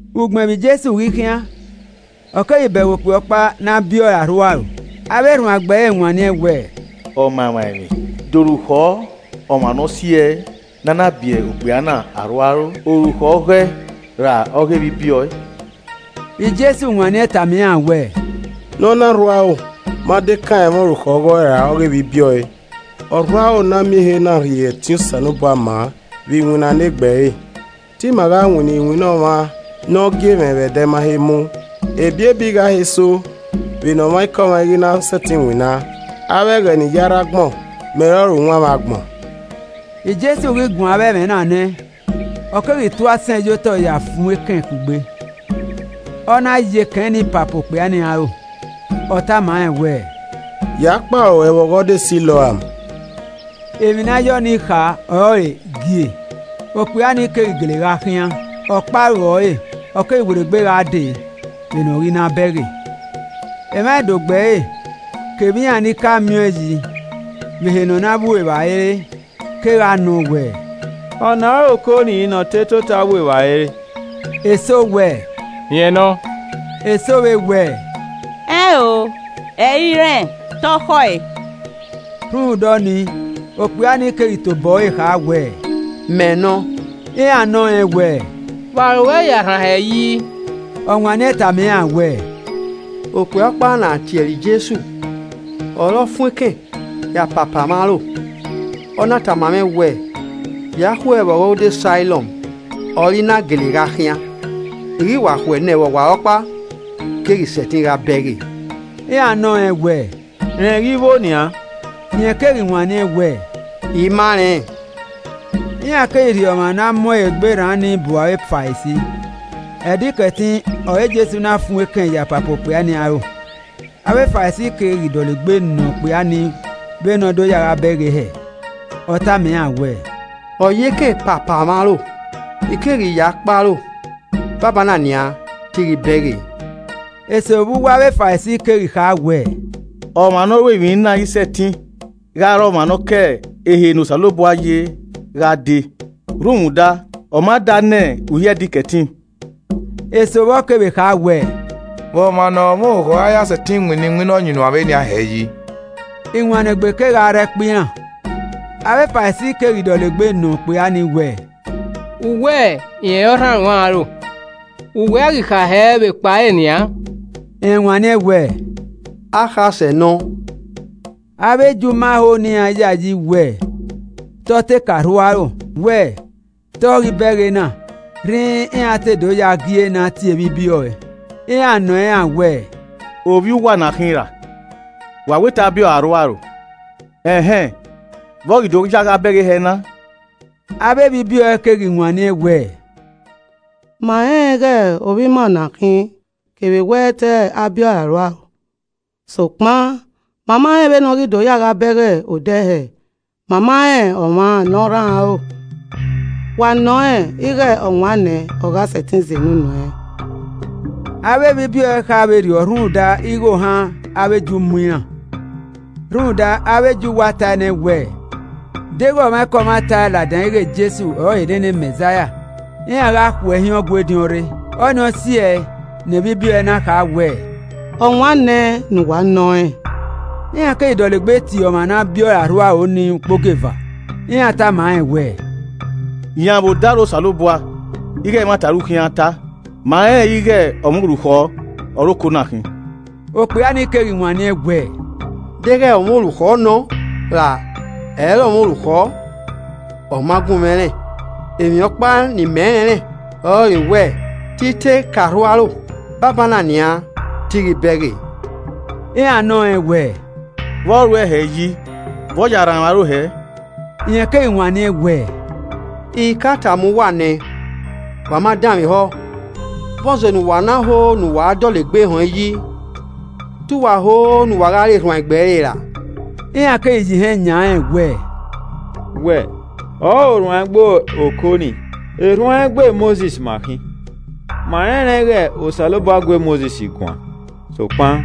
Ugbẹn vbe Jesu ghi khian, ọ keghi bẹghe okpia ọkpa ne a biẹ ọre arhuaro. Avbe erhuanegbe ẹre wanniẹn wẹẹ, “Ọmamwaemwi, de orukhọ ọmwa ne ọ si ẹe ne a na biẹ okpia na arhuaro? Orukhọ ọghọe ra ọghe evbibiẹ ọe?” Jesu wanniẹn tama iran wẹẹ, “Ne ọna rhu aro ma dekan ẹmwẹ orukhọ ọghọe ra ọghe evbibiẹ ọe. Ọ rhu aro ne a miẹn ehe na rhie ẹtin Osanobua ma vbe iwinna ne egbe ẹre. Te imẹ gha winna iwinna ọmwa ne ọ gie mwẹ vbe ẹdẹ ma he mu, ebiebi gha he so vbe nẹ ọmwaikọmwa i ghi ra na sẹtin winna. Avbe ẹghẹ ne I ya rre agbọn, mẹ ọrọre uwanmwẹ agbọn.” Jesu ghi guan avbe ẹmwẹ na nẹ, ọ keghi tu asẹn ye otọ ya fuẹn ekẹn kugbe, ọ na ya ekẹn ni papa okpia ni aro. Ọ tama rẹn wẹẹ, “Ya kpe aro ruẹ vbe ọghọdọ Siloam.” (Emwi ne a ya ọnii kha ọrọre, “Gie.”) Okpia ni keghi gele gha khian, ọ kpe aro ẹre, ọ keghi werriegbe gha dee vbene ọ ghi na bẹghe. Emwa ẹdogbo ẹre, kevbe iran ni ka miẹn ọẹn yi vbe ehe ne ọ na vbu evbare re kegha nọ wẹẹ, “Ọna i re oko ni ne ọ te tota vbu evbare re?” Eso wẹ, “Rẹn nọ.” Eso vbe wẹẹ, “Ẹn o, ẹ i re irẹn, te ọ khọe.” Rhunmwuda ọnii okpia ni keghi tobọ ẹre kha wẹẹ, “Mẹ nọ.” Iran nọ rẹn wẹẹ, “Vbe aro ruẹ ya rhan hẹ yi?” Ọ wanniẹn tama iran wẹẹ, “Okpia ọkpa ne a tie ẹre Jesu ọre ọ fuẹn ekẹn ya papa mwẹ aro, ọ na tama mwẹ wẹẹ, ‘Ya khue vbe Ọghọdọ Siloam’ ọre I na gele gha khian. I ghi wa khue nẹ vbe ọwarọkpa, I keghi sẹtin gha bẹghe.” Iran nọ rẹn wẹẹ, “Rẹn ghi vbo nian?” Rẹn keghi wanniẹn wẹẹ, “I ma rẹn.” Iran keghi rhie ọmwa ne a mu ẹre egbe rran ni bu avbe Farisi. Ẹdẹ Ikẹtin ọre Jesu na fuẹn ekẹn ya papa okpia ni aro. Avbe Farisi keghi dọlegbe nọ okpia ni vbene ọ do ya gha bẹghe hẹẹ. Ọ tama iran wẹẹ, “Ọ ye ekẹn papa mwẹ aro, I keghi ya kpe aro. Banbanna nian te I ghi bẹghe.” Eso vbe uwu avbe Farisi keghi kha wẹẹ, “Ọmwa ne ọ ru emwi na i sẹtin gha re ọmwa ne ọ ke ehe ne Osanobua ye gha dee, rhunmwuda ọ ma da ne uhi Ẹdẹ Ikẹtin.” Eso vbọ kevbe kha wẹẹ, “Vbe ọmwa ne ọre ọmwa orukhọ ra ya sẹtin winna iwinna ọyunnuan vbenian hẹ yi?” Iwannegbe kegha rre ẹkpo iran. Avbe Farisi keghi dọlegbe nọ okpia ni wẹẹ, “U wẹ rẹn ọre ọ rhan ruẹn aro, vbe uwẹ a ghi kha hẹ vbe ekpa ẹre nian?” Rẹn wanniẹn wẹẹ, “Akhasẹ nọ.” Avbe Ju ma ho ne iran yayi wẹ te ọ te ka rhu aro, wẹ, te ọ ghi bẹghe na rhinrin iran to do ya gie ne a tie evbibiẹ ọe. Iran nọ iran wẹẹ, “Ovbi uwa ọna khin ra? Wa wẹ te a biẹ ọre arhuaro? Ẹn hẹn, vbe ọ ghi do ya gha bẹghe hẹ na?” Avbe evbibiẹ ọe keghi wanniẹn wẹẹ, “Ma rẹnrẹn ighe ovbi ima ọ na khin kevbe wẹ te a biẹ ọre arhuaro. Sokpan ma ma rẹn vbene ọ ghi do ya gha bẹghe odẹ hẹ, ma ma rẹn ọmwa ne ọ rhan ẹre aro. Wa nọ rẹn ighe ọ wan nẹ, ọ gha sẹtin zẹ ne unu ẹnrẹn.” Avbe evbibiẹ ọe kha vberriọ rhunmwuda ighe ohan avbe Ju mu iran, rhunmwuda avbe Ju wa tae nẹ wẹẹ deghẹ ọmwaikọmwa tae ladian ighe Jesu ọrọre nene Mẹzaia, iran gha khu ẹe hin Ọgua ediọn rre. Ọnii ọ si ẹe ne evbibiẹ ọe na kha wẹ, “Ọwan nẹ ne uwa nọ rẹn.” Iran keghi dọlegbe tie ọmwa na biẹ ọre arhuaro ni ukpogieva, iran tama rẹn wẹẹ, “Yan vbe odaro Osanobua ighe ẹmwata ọre u khian ta. Ma rẹnrẹn ighe ọmwa orukhọ ọre oko na khin.” Okpia ni keghi wanniẹn wẹẹ, “Deghẹ ọmwa orukhọ nọ ra ẹ i re ọmwa orukhọ ọ ma gun mwẹ rẹn, emwi ọkpa ne imẹ rẹnrẹn ọrọre wẹẹ, te i te ka rhu aro, banbanna nian, te I ghi bẹghe.” Iran nọ rẹn wẹ, “Vbọ ruẹ hẹ yi, vbe ọ ya rhan ruẹn aro hẹẹ?” Rẹn keghi wanniẹn wẹ, “I ka tama uwa nẹ, wa ma danmwehọ, vbọzẹ ne uwa na ho ne uwa dọlegbe họẹn yi? Te uwa ho ne uwa gha re erhuanegbe ẹre ra?” Iran keghi ya ihẹn yan rẹn wẹẹ, “Wẹ ọrọre ọrhuanegbe oko nii, erhuanegbe Mosis ma khin. Ma rẹnrẹn ighe Osanobua gu e Mosis guan. Sokpan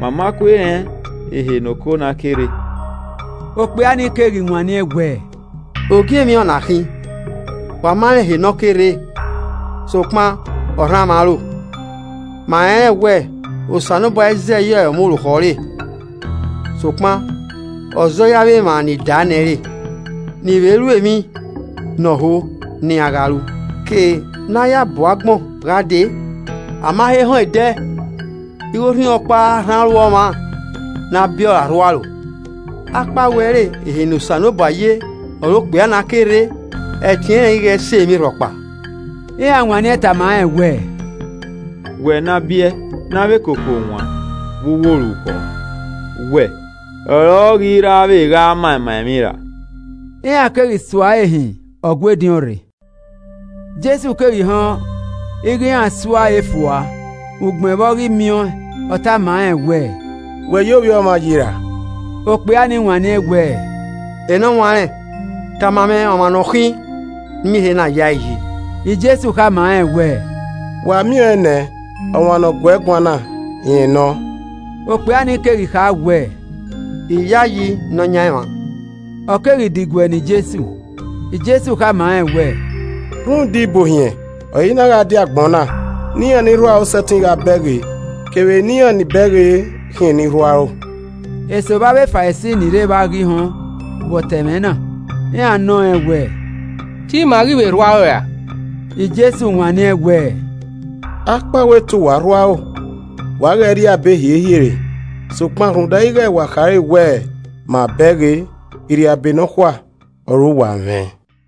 ma ma kue rẹn ehe ne oko na ke rre.” Okpia ni keghi wanniẹn wẹẹ, “Ogie emwi ọ na khin. Wa ma rẹn ehe ne ọ kere, sokpan ọ rhan mwẹ aro! Ma rẹnrẹn wẹ Osanobua i zẹ ye ọmwa orukhọ ẹre, sokpan ọ zẹ ye avbe emwa ni daa nẹ re, ni vbe ru emwi ne ọ ho ne iran gha ru. Ke ne a ya bu agbọn gha dee, a ma he họẹn ẹdẹ ighẹ orhunmwu ọkpa rhan aro ọmwa ne a biẹ ọre arhuaro. Akpawẹ ẹ i re ehe ne Osanobua ye ọre okpia na ke rre, ẹtin ẹnrẹn i ghẹ sẹ emwi rhọkpa.” Iran wanniẹn tama rẹn wẹẹ, “Wẹ ne a biẹe ne avbe koko wan vbe uwu orukhọ, wẹ ọre ọ ghi ra vbe gha ma ima emwi ra?” Iran keghi suare hin Ọgua ediọn rre. Jesu keghi họn ighẹ iran sua ẹre fua, ugbẹn vbe ọ ghi miẹn ọẹn, ọ tama rẹn wẹẹ, “Wẹ ya Ovbi Ọmwa yi ra?” Okpia ni wanniẹn wẹẹ, “Enọwanrẹn, tama mwẹ ọmwa ne ọ khin ne I miẹn ehe na yae yi.” Jesu khama rẹn wẹẹ, “Wa miẹn ọẹn nẹ, ọmwa ne ọ guẹe guan na, rẹn nọ.” Okpia ni keghi kha wẹẹ, “I yayi Nọyaẹnmwa.” Ọ keghi diguẹ ne Jesu. Jesu khama rẹn wẹẹ, “Rhunmwuda ibuohiẹn, ọre I na gha die agbọn na. Ne iran ni rhu aro sẹtin gha bẹghe, kevbe ne iran ni bẹghe khian eni rhu aro.” Eso vbe avbe Farisi ni rre evba ghi họn vbe ọ ta ẹmwẹ na, iran nọ rẹn wẹẹ, “Te ima ghi vbe rhu aro ra?” Jesu wanniẹn wẹẹ, “Akpawẹ te uwa rhu aro, wa ghẹ rria abe hiehie re, sokpan rhunmwuda ighẹ wa khare wẹẹ, ‘Ma bẹghe!’ irriabe nọkhua ọre uwa mwẹ.”